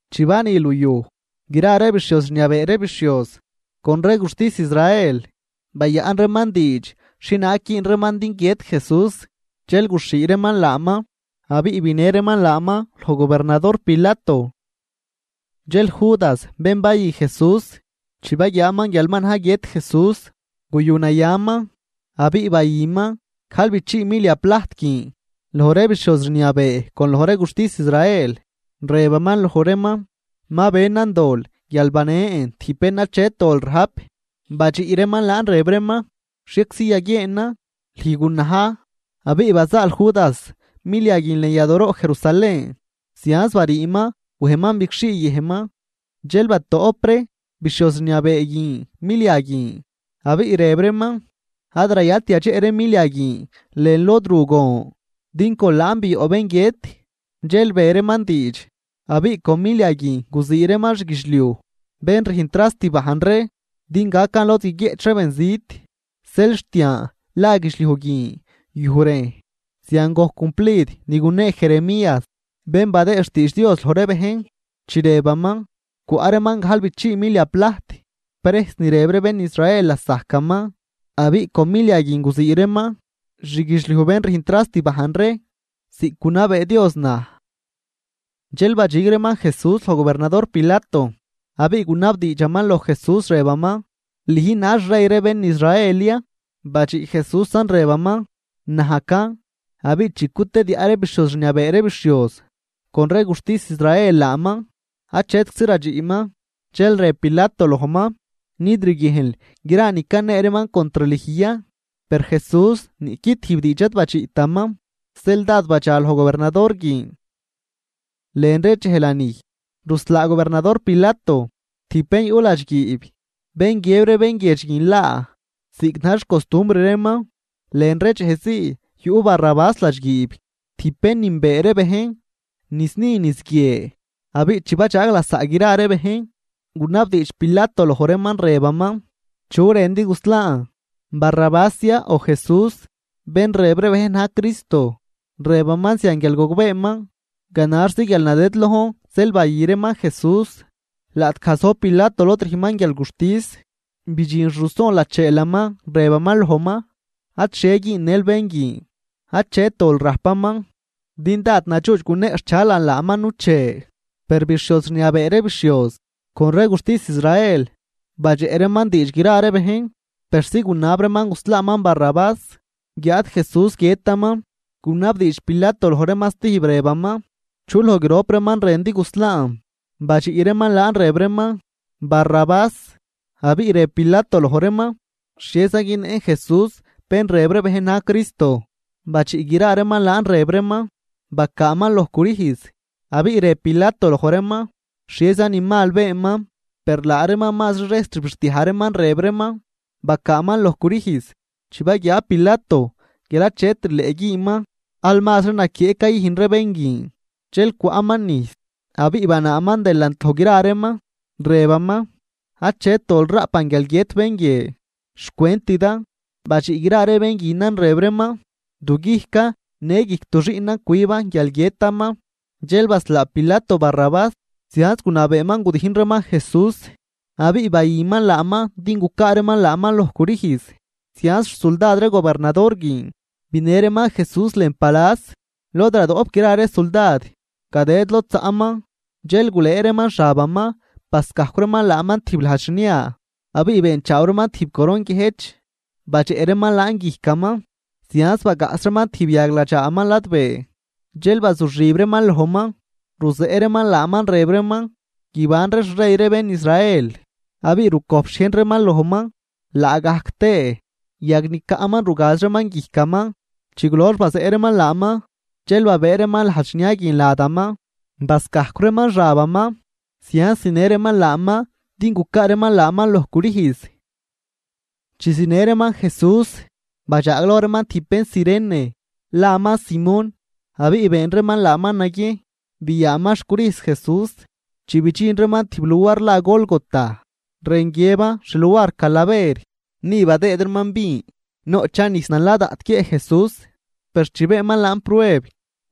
Chi bani luyuj, gra ree bixhioz rniabee ree bixhioz con ree guxtis Israel bayaꞌn reeman diidx xhienaag güün reeman din guiët Jesús. Dxel guxhii reeman laaman abiꞌ binë reeman laaman loj gobernador Pilato. Dxel Judas, bén bayü Jesús, chi baguiaaman guial ma na̱j guiët Jesús, guyunayaman, abiꞌ bayüman gajlbichii milia plajt guin loj ree bixhioz rniabee con loj ree guxtis Israel, rëbaman loj reeman: ―Ma benan dol guial banen tijb bén achet dol rajp. Badxiꞌ reeman laan rëb reeman: ―Xhieczi yaguieenan, ¡lüj gunaj! Abiꞌ bazaal Judas milia guin lën yadooroꞌ Jerusalén zianz bariiman wejman bigxhii yëjnman. Dxel batoꞌp ree bixhioz rniabee guin milia guin, abiꞌ rëb reeman: ―Ad rayalt yadxeꞌ ree milia guin lën lod ru gon, din con laan bioꞌ bén guiët. Dxel be reeman diidx, abiꞌ con milia guin guzii reeman xguidxliuj bén rüjn trast bajn ree, din gacan lod guiguieꞌch ree benzit. Zeel xt yan la guidxliuj guin Yuj Rejn. Zian gojc cumplid ni gunee Jeremías, bén badëë xtiidx Dios loj ree bejn, chi rëbaman: “Cwaꞌ reeman gajlbichii milia plajt, prejs ni rëb ree bén Israel lasajcaman, abiꞌ con milia guin guzii reeman xguidxliuj bén rüjn trast bajn ree, ziꞌc gunabee Dios naj.” Dxel badxig reeman Jesús loj gobernador Pilato, abiꞌ gunabdiidxaman loj Jesús, rëbaman: ―¿Lüjn na̱j xrey ree bén Israel ya? Badxiꞌ Jesúsan, rëbaman: ―Najcan. Abiꞌ chi cutediaꞌ ree bixhioz rniabee ree bixhioz con ree guxtis Israel laaman, achetczi radxiꞌman. Dxel rëb Pilato lojman: ―¿Nid riguiejnl gra ni canee reeman contr lüj ya? Per Jesús niꞌqui tijb diidx ad badxiꞌtaman, zeel dád badxa loj gobernador guin. Lën ree dxej lanij, ruslaa gobernador Pilato tijb bén yuꞌ ladxguiib bén guiëb ree bénguiedx guin laa, ziꞌc na̱j xcostumbr reeman. Lën ree dxejzii yuꞌ Barrabás ladxguiib, tijb bén nünbee ree bejn niz ni niz guie. Abiꞌ chi badxaag lasaꞌ gra ree bejn, gunabdiidx Pilato loj reeman, rëbaman: ―¿Chu rëndi guslaan? ¿Barrabás ya, o Jesús, bén rëb ree bejn na̱j Cristo? Rëbaman zian guial gogbeeman ganaxzi guialnadëdlojn zeel bayü reeman Jesús. Laꞌtgaj zojb Pilato lod rüjnman guialguxtis, bidxin xruson lacheelaman, rëbaman lojman: “Adxhie güünnël bén guin achet dol rajpaman, din dád nadxuudx guneꞌxchalan laaman nuche.” Per bixhioz rniabee ree bixhioz con ree guxtis Israel, badxeꞌ reeman diidx gra ree bejn persi gunab reeman guslaaman Barrabás, guiáad Jesús guiëtaman. Gunabdiidx Pilato loj reeman stijb, rëbaman: ―¿Chu loj grop reeman rëndi guslaan? Badxiꞌ reeman laan rëb reeman: ―Barrabás. Abiꞌ rëb Pilato loj reeman: ―¿Xhieza günnëꞌn Jesús, bén rëb ree bejn na̱j Cristo? Badxiꞌ gra reeman laan rëb reeman: ―¡Bacaaman loj crüjz! Abiꞌ rëb Pilato loj reeman: ―¿Xhieza ni mal beenman? Per laa reeman mazri rejs rbixdiaj reeman, rëb reeman: ―¡Bacaaman loj crüjz! Chi baguiaa Pilato guial achet rileꞌ güünman, al mazri naquieꞌ cayüjn ree bén guin, dxel cwaꞌman nijs abiꞌ banaaman delant loj gra reeman, rëbaman: ―Achet dol raꞌpan guial guiët bén guie, xcwentidan. Badxiꞌ gra ree bén guinan rëb reeman: ―¡Du guijcan, në guijc du xiꞌnan cwiban guial guiëtaman! Dxel baslaa Pilato Barrabás, zianz gunabeeman gudijn reeman Jesús abiꞌ bayüman laaman din gucaa reeman laaman loj crüjz. Zianz xsuldad ree gobernador guin binë reeman Jesús lën palas lod badoꞌp gra ree suldad, gadëd lod zaꞌman. Dxel gulëë reeman xabaman bascajcw reeman laaman tijb lajd xnia. Abiꞌ beenchaaw reeman tijb coron guiëjch badxeꞌ reeman laan guijcaman, zianz bagaꞌs reeman tijb yag ladxaaman ladbee. Dxel bazuxib reeman lojman, ruzeꞌ reeman laaman, rëb reeman: ―¡Guibanri xrey ree bén Israel! Abiꞌ rucojp xhiejn reeman lojman, laagajc tëë yag ni caꞌman rugaz reeman guijcaman. Chi gulox bazeꞌ reeman laaman, dxel babëë reeman lajd xnia guin ladaman, bascajcw reeman xabaman, zianz zinë reeman laaman din gucaa reeman laaman loj crüjz. Chi zinë reeman Jesús, badxaagloj reeman tijb bén Cirene, laman Simón, abiꞌ been reeman laaman naguiejn byaaman xcrüjz Jesús. Chi bidxin reeman tijb luar la Gólgota (rën guiëban Xluar Calaver), ni badëëd reeman vin, noꞌchan nijs nala daꞌt guiëꞌ Jesús. Per chi beenman laan prueb,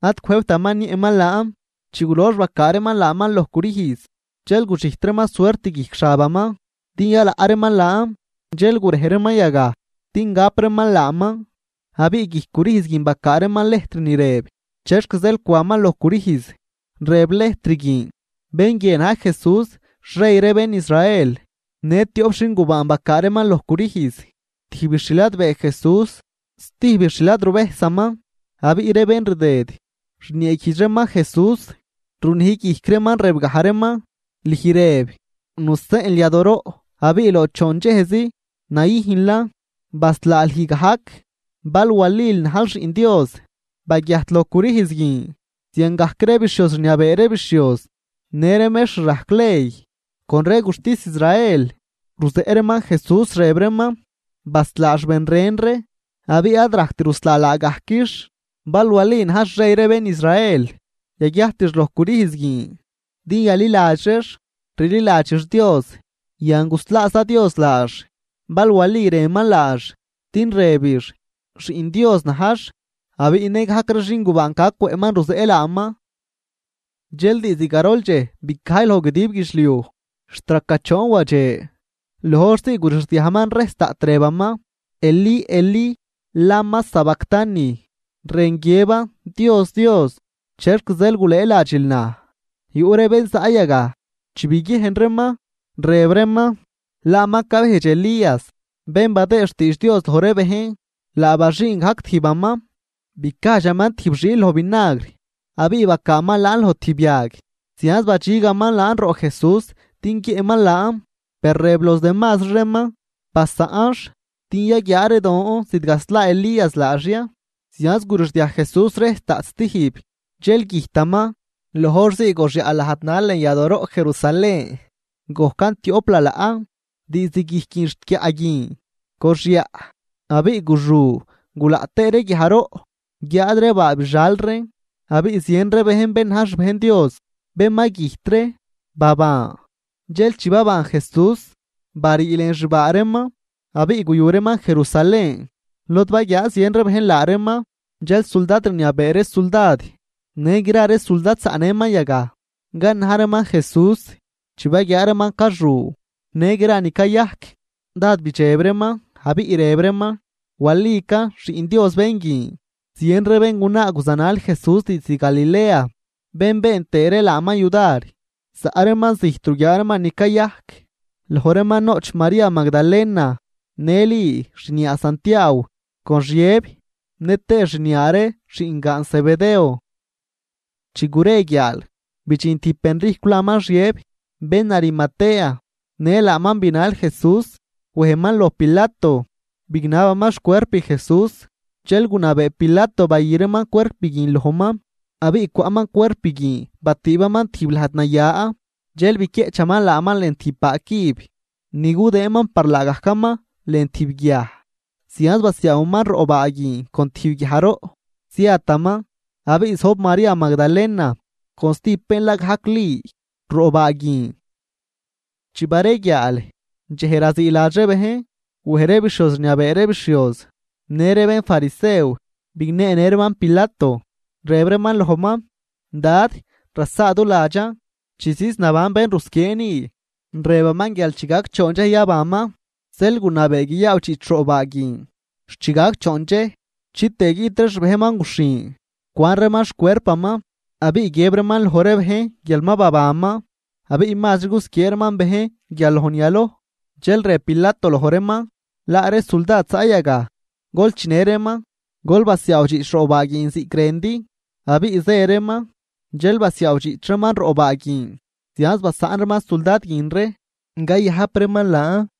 ad cwëjbtaman niëꞌman laan. Chi gulox bacaa reeman laaman loj crüjz, dxel gudxijt reeman suert guijc xabaman din yalaꞌ reeman laan. Dxel gurej reeman yagaj din gap reeman laaman. Abiꞌ guijc crüjz guin bacaa reeman lejtr ni rëb, chexc zeel cwaman loj crüjz. Rëb lëjtr guin: “BEN GUIE NA̱J JESÚS XREY REE BEN ISRAEL.” Në tioꞌp xin gubaan bacaa reeman loj crüjz, tijbix xladbee Jesús stijbix xladruvejsaman. Abiꞌ ree bén rdëd, rnieeguijdx reeman Jesús, runij guijc reeman, rëbgaj reeman: ―Lüj rëb, nuseꞌnl yadooroꞌ abiꞌ loj choon dxejzi nayüjnlan, baslaa lüj gajc. Bal walil najl Xiꞌn Dios baguiajt loj crüjz guin. Ziangajc ree bixhioz rniabee ree bixhioz në ree mextr rajc ley con ree guxtis Israel, ruzeꞌ reeman Jesús, rëb reeman: ―Baslaax ben ren ree, abiꞌ ad rajct ruslaa laagajquix. Bal wali najx xrey ree bén Israel, yaguiajtix loj crüjz guin, din yaliladx reex. Rililadxix Dios. ¡Yan, guslaaza Dios laax, bal wali rënman laax, din rëbix: “Xiꞌn Dios najx”! Abiꞌ nëgajc ree xingubaan ca cwëꞌman ruzeꞌ laaman. Dxel diizd garol dxej bicajy loj guidib guidxliuj, xt raca choon wadxe. Loj horzii gurixdiajman rejs daꞌt, rëbaman: ―Elí, Elí, ¿lama sabactani? ―rën guiëban: Dios, Dios, ¿chexc zeel gulëëladxil naj? Yuꞌ ree bén zaꞌ yagaj, chi biguiejn reeman, rëb reeman: ―Laaman cabejdx Elías, bén badëë xtiidx Dios loj ree bejn. Laa baxüün gajc tijbaman bicajdxaman tijb xiil loj vinagr, abiꞌ bacaaman laan loj tijb yag zianz badxigaman laan roꞌ Jesús din guiëꞌman laan. Per rëb los demazri reeman: ―Basaꞌnx, din yaguiaa ree don zidgaslaa Elías laax ya. Zianz gurixdiaj Jesús rejs daꞌt stijb, dxel güjtaman. Loj hor zii goxyaꞌ lajd nal lën yadooroꞌ Jerusalén gojcan tioꞌp lalaꞌ, diizd guijc guin xt guiaꞌ guin goxyaꞌ. Abiꞌ guxu, gulaꞌ tëë ree guiajroꞌ. Guiáad ree baa bixal reen, abiꞌ zien ree bejn bén na̱j xbejn Dios, bén ma güjt ree baban. Dxel chi baban Jesús, barii lën xbaa reeman, abiꞌ guyu reeman Jerusalén, lod baguiaa zien ree bejn laa reeman. Dxel suldad rniabee ree suldad në gra ree suldad zaꞌnëman yagaj canaj reeman Jesús, chi baguiaa reeman caxu në gra ni cayajc, dád bidxeb reeman abiꞌ rëb reeman: ―Walican Xiꞌn Dios bén guin. Zien ree béngunaa guzanal Jesús diizd Galilea, bén been tëë ree laaman yudar, zaꞌ reeman zijt ruguiaa reeman ni cayajc. Loj reeman noꞌch María Magdalena, në Li xniaa Santiaaw con Xiëb nëtëë xniaa ree xiꞌngaan Zebedeo. Chi gure guiaal, bidxin tijb benrijcw laman Xiëb, bén Arimatea, në laaman binal Jesús. Wejman loj Pilato, bignabaman xcuerp Jesús. Dxel gunabee Pilato bayü reeman cuerp guin lojman. Abiꞌ cwaꞌman cuerp guin batüübaman tijb lajd naya. Dxel biquieꞌchaman laaman lën tijb baa cüb ni gudëënman par laagajcaman lën tijb guiaj. Zianz basiaawaman roꞌ baa guin con tijb guiajroꞌ, ziataman. Abiꞌ zojb María Magdalena con stijb bén la gajc Li, roꞌ baa guin. Chi bareguiaal, dxej raziiladx ree bejn, wej ree bixhioz rniabee ree bixhioz në ree bénfarisew, bigneenë reeman Pilato, rëb reeman lojman: ―Dad, rasaaduladxan, chi ziz naban bén rusquiee ni, rëbaman guial chi gac choon dxej yabanman. Zeel gunabee guiyaawdxiꞌch roꞌ baa guin xt chi gac choon dxej, chitëë guiꞌt ree xbejnman guxhin cwan reeman xcuerpaman. Abiꞌ guiëb reeman loj ree bejn guial ma babanman. Abiꞌ mazri gusquiee reeman bejn guial loj ni yaloj. Dxel rëb Pilato loj reeman: ―Laa ree suldad zaꞌ yagaj. Gol chinë reeman, gol basiaawdxiꞌch roꞌ baa guin ziꞌc rëndi. Abiꞌ zë reeman, dxel basiaawdxiꞌch reeman roꞌ baa guin. Zianz basaꞌn reeman suldad guin ree cayajp reeman laan.